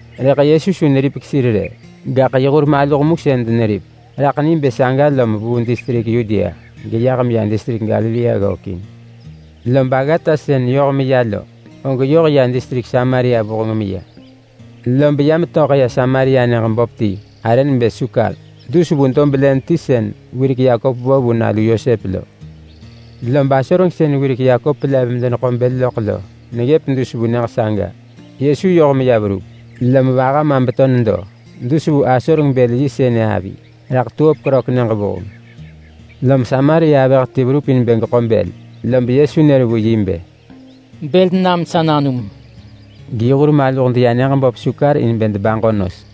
(Rëḳ Yesu su neripek sir rë, gaḳ yi hur maluh mu sën deneripek.) Nġo nebë saga lom vuu distrik Yudea geyah meya distrik Galilea ggökin. Lob aggata sën yoh meya lo, og yoh ya distrik Samaria vuheng meya. Lob ya metöḳ ya Samaria nyëġ böp ti arë nebë Sukar, dus vu dob len ti sën wirek Yakop vo vu nalu Yosep lo. Lob asoreng sën wirek Yakop lev medeneḳo bël loḳ lo neggëp dus vu nyëġ saga. Yesu yoh meya verup, lom vaha ma beto nedo dus vu asoreng-bël-yi sënë avi. Raḳ siks krök sehuksën. Lom Samaria avëh ti verup in bë geḳo bël, lob Yesu nër vu yi bë, “Bël nam sa nanum!” In yi hur maluh deya nyëġ böp Sukar in bë debaġo nos.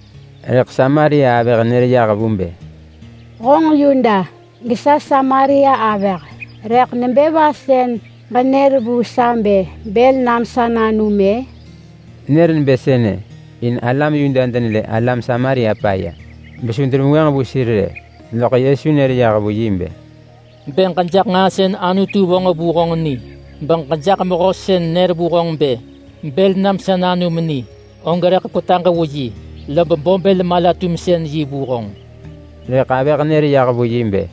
Rëḳ Samaria avëh nër yah vu bë, “Honġ Yuda, gesa Samaria avëh, rëḳ nebë va sën ġenër vu sa bë ‘Bël nam sa nanum’—ë?” Nër nebë sënë in alam Yuda denelë alam Samaria paya besu denevengwënġ vu sir rë. Loḳ Yesu nër yah vu yi bë, “Bë ġejaḳ nġaa sën Anutu vonġ vu honġ ni, beġejaḳ mehöti sën nër vu honġ bë ‘Bël nam sa nanum’ ni, og rëḳ kwetaġ vu yi lob bo bël-mala-tumsën-yi vu honġ.” Rëḳ avëh nër yah vu yi bë,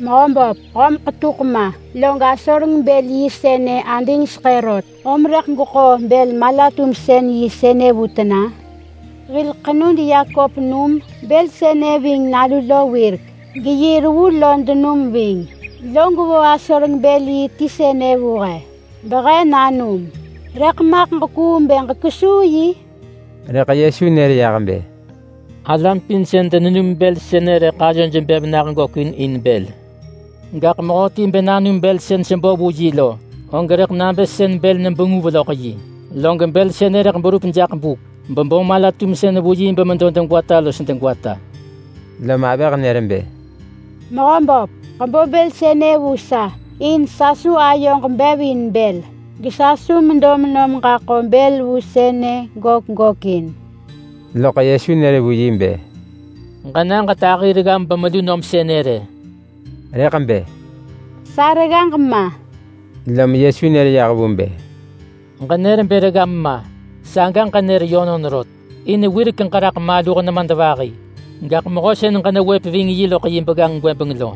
“Mehöböp, höm ḳetuḳ ma, log asoreng-bël-yi sënë adingseḳë rot, om rëḳ gweḳo bël-mala-tumsën-yi sënë vu tena? Hil ḳenud Yakop num bël sënë ving nalu lo wirek, geyi reggu lo denum ving, log vo asoreng-bël-yi ti sënë vu he behe nanum. Rëḳ maḳ ġekuung bë ġekwesuu yi?” Rëḳ Yesu nër yah bë, “Alam pin sën denenum bël sënë rëḳ ayoj bev nah gökin in bël. Gaḳ mehöti bë nanum bël sën sebo vu yi lo, og rëḳ nabë sën bël nebenguv loḳ yi. Log bël sënë rëḳ berup jaḳ buk, bebo mala-tumsën vu yi bemedo degwata los degwata.” Lom avëh nër bë, “Mehöböp, ġebo bël sënë vu sa in sa su ayoġ bev in bël, gesa su medo menom ġaḳo bël vu sënë gök gökin!” Loḳ Yesu nër vu yi bë, “Ġena ġetahi reggam bemelu nom sënë rë!” Rëḳ bë, “Sa reggaġ ma!” Lom Yesu nër yah vu bë, “Ġenër bë reggam ma, saga ġenër yönon rot. In wirek ġeraḳ maluh nemadvahi. Gaḳ mehö sën ġenewëp ving yi loḳ yi begganġ gwëbeng lo,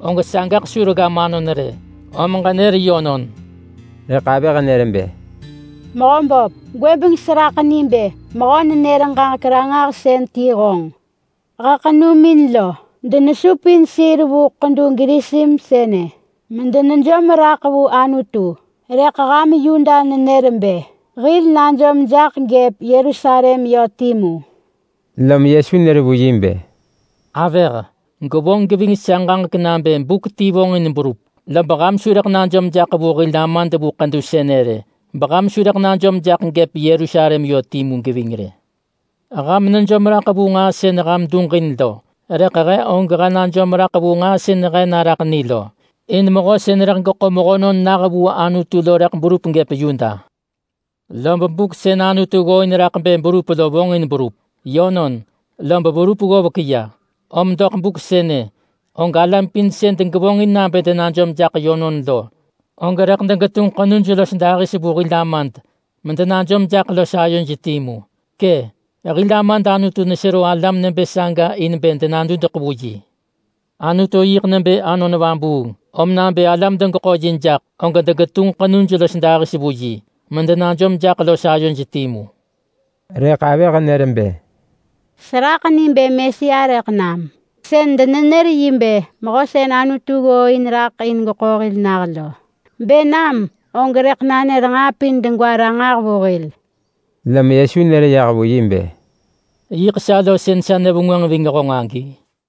og sagaḳ su reggam anon rë! Om ġenër yönon!” Rëḳ avëh nër bë, “Mehöböp, gwëbeng seraḳ ni bë mehö-nenër-ġaġek-ranġahsën ti honġ! He ḳenumin lo denesupin sir vu ḳedu Gerisim sënë medenejom raḳ vu Anutu, rëḳ ham Yuda nenër bë hil najom jaḳ gëp Yerusalem yö timu.” Lom Yesu nër vu yi bë, “Avëh, gwevonġ geving sa ġaġek nabë buk ti vonġin berup, lob ham su rëḳ najom jaḳ vu hil Amad vu ḳedu sënë rë, beham su rëḳ najom jaḳ gëp Yerusalem yö timu geving rë. Ham nejom raḳ vu nġaa sën ham duġin lo, rëḳ he og he najom raḳ vu nġaa sën he naraḳ ni lo. In mehö sën rëḳ geḳo mehönon nah vu Anutu lo rëḳ berup gëp Yuda. Lob buk sën Anutu ggooin raḳ bë berup lo vonġin berup. Yönon, lob verup ggovek ya, om doḳ buk sënë og alam pin sën degevonġin nabë denajom jaḳ yönon lo, og rëḳ degetunġ ḳenuj los dahis vu hil Amad medenajom jaḳ los ayoj timu. Kë’, hil Amad Anutu nesero alam nebë saga in bë denadudeḳ vu yi. Anutu yiḳ nebë Anon Vabuung. Om nabë alam degeḳo yi jaḳ, og degetunġ ḳenuj los dahis vu yi, medenajom jaḳ los ayoj timu.” Rëḳ avëh nër bë, “Seraḳ ni bë Mesia rëḳ nam. Sën denenër yi bë Mehö sën Anutu ggooin raḳ in bë geḳo hil nah lo. Bë nam, og rëḳ nanër nġaa pin degwa ranġah vu hil.” Lom Yesu nër vu yi bë, “Yiḳ sa lo sën sa nevengwënġ ving honġ agi!”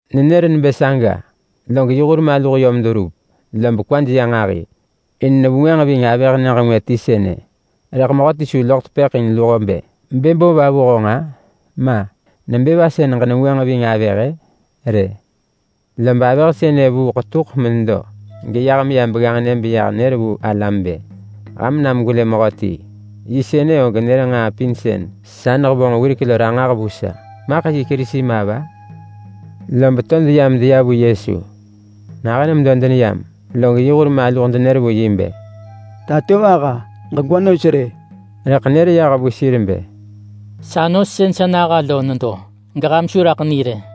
Nenër nebë saga log yi hur maluh yom deverup. Lob kwaj ya nġahi in nevengwënġ ving avëh nyëġ ngwë ti sënë, rëḳ mehöti su loḳ tepëḳ in luho bë, “Bë bo va vu honġ-a?”, ma, “Nebë va sën genevengwënġ ving avëh-ë?” rë. Lob avëh sënë vuu yi ḳetuḳ menedo, geyah meya begganġnë beyah nër vu yi alam bë, “Ham nam gwelë mehöti! Yi sënë og nër nġaa pin sën sa nehevonġ wirek lo ranġah vu sa. Maḳ yi Kerisi ma va?” Lob to deya medeya vu Yesu. Nahën medo deneyam, log yi hur maluh denenër vu yi bë, “Tatovaha, ġegwa nos rë!” Rëḳ nër yah vu sir bë, “Sa nos sën sa naha lo nedo, geham su raḳ ni rë.”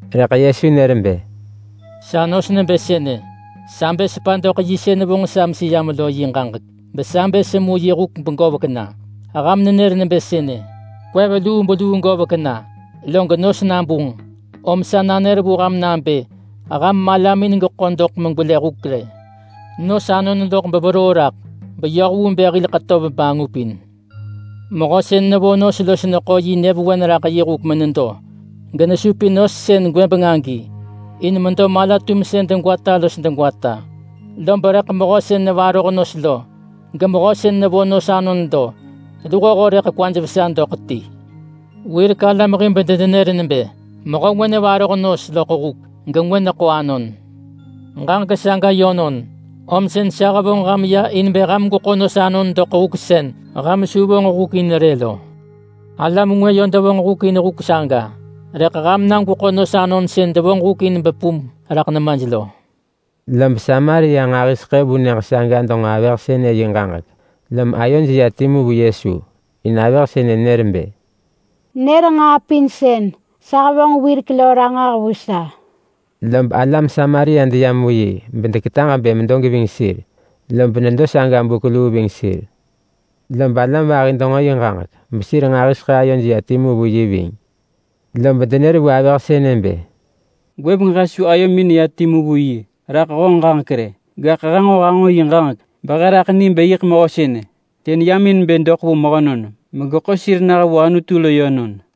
Rëḳ Yesu nër bë, “Sa nos nebë sënë: Sa bë sepa doḳ yi sën vonġ sa meseyam lo yi ġaġek. Besa bë semu yi huk begovek na. Ham nenër nebë sënë, ‘Kwev lubeluu govek na log nos nabunġ!’, rëḳ sa nanër vu ham nabë ham malamin jaḳ megeḳo doḳ megwelë huk rë. Nos anon loḳ beveroo raḳ beyoh vu bë hil ḳetöv bangupin. Mehö sën nevo nos lo neḳo yi nyëvewen raḳ yi huk menedo, genesupin nos sën gwëbeng agi in medo mala-tumsën degwata los degwata, lob rëḳ mehö sën nevaroh nos lo gemehö sën nevo nos anon lo, luhoho rëḳ kwaj vesa doḳ ti. Wirek alam hib denenër nebë, ‘Mehö ngwë nevaroh nos loḳ huk gengwë neḳo anon.’ Ġaġek saga yönon, om sën sa hevonġ ham ya in bë ham gweḳo nos anon doḳ huk sën ham su vonġ huk in rë lo. Alam ngwë yö devonġ huk in huk saga, rëḳ ham na gweḳo nos anon sën devonġ huk in bepum raḳ nemaj lo.” Lob Samaria nġahiseḳë vu nyëġ saga denġo avëh sënë yi ġaġek, lom ayoj ya timu vu Yesu. In avëh sënë nër bë, “Nër nġaa pin sën sa hevonġ wirek lo ranġah vu sa!” Lob alam Samaria deyam vu yi bedeketaġ bë medo geving sir, lob nedo saga buk luu ving sir. Lob alam vahi denġo yi ġaġek besir nġahiseḳë ayoj ya timu vu yi ving. Lob denër vu avëh sënë bë, “Gwëbeng he su ayomin neya timu vu yi raḳ honġ ġaġek rë, gaḳ he nġo hanġo yi ġaġek behe raḳ ni bë yiḳ Mehö sënë, sën yam in bë doḳ vu mehönon megeḳo sir nah vu Anutu lo yönon.”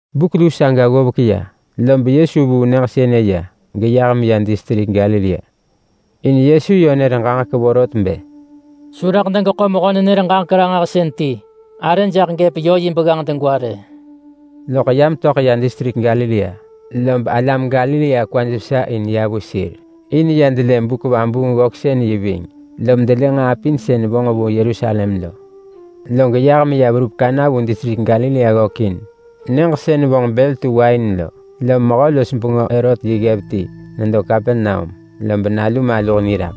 Buk luu saga ggovek ya, lob Yesu vuu nyëġ sënë ya geyah meya distrik Galilea. In Yesu yö nër ġaġek vorot bë, “Su rëḳ degeḳo mehö-nenër-ġaġek-ranġahsën ti arë jaḳ gëp yö yi begganġ degwa rë!” Loḳ ya metöḳ ya distrik Galilea, lob alam Galilea kwaj vesa in ya vu sir, in ya delë buk-vabuung-ggöksën-yi ving, lom delë nġaa pin sën vonġ vu Yerusalem lo. Log yah meya verup Kana vu distrik Galilea ggökin,—nyëġ sën vonġ bël tu wain lo. Lom mehö-los-bengö Herot yi ggev ti nedo Kapernaum, lob nalu maluh niraḳ.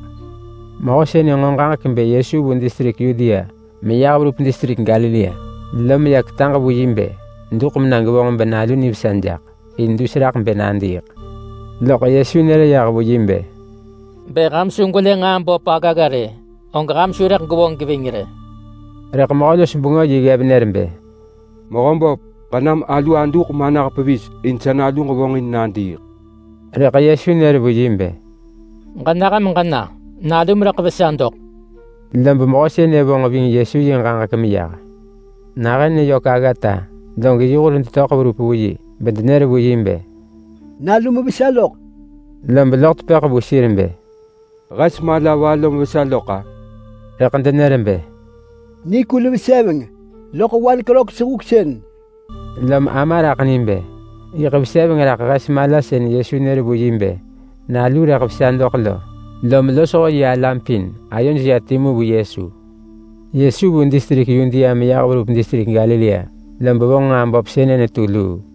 Mehö sënë nġo ġaġek bë Yesu vu distrik Yudea meyah verup distrik Galilea, lom ya ketaġ vu yi bë duḳ mena gevonġ benalu nivesa jaḳ, in dus raḳ bë nadiiḳ. Loḳ Yesu nër yah vu yi bë, “Bë ham su gwelë nġaa böp aggagga rë, og ham su rëḳ gwevonġ geving rë!” Rëḳ mehö-los-bengö yi ggev nër bë, “Mehöböp, ġenam alu aduḳ manah pevis in sa naluġ vonġin nadiiḳ!” Rëḳ Yesu nër vu yi bë, “Ġenah meġena! Nalum rëḳ vesa doḳ.” Lob mehö sënë vonġ ving Yesu yi ġaġek meyah. Nahën neyök aggata log yi hur detöḳ verup vu yi bedenër vu yi bë, “Nalum vesa lok!” Lob loḳ tepëḳ vu sir bë, “Hes mala va lom vesa loḳ-a?” Rëḳ denër bë, “Nikul veseveng loḳ seven krök buk.” Lom ama raḳ ni bë yiḳ veseveng raḳ hes mala sën Yesu nër vu yi bë nalu rëḳ vesa doḳ lo. Lom losho yi alam pin ayoj ya timu vu Yesu. Yesu vu distrik Yudea meyah verup distrik Galilea lo, lob vonġ nġaa böp sënë netu luu.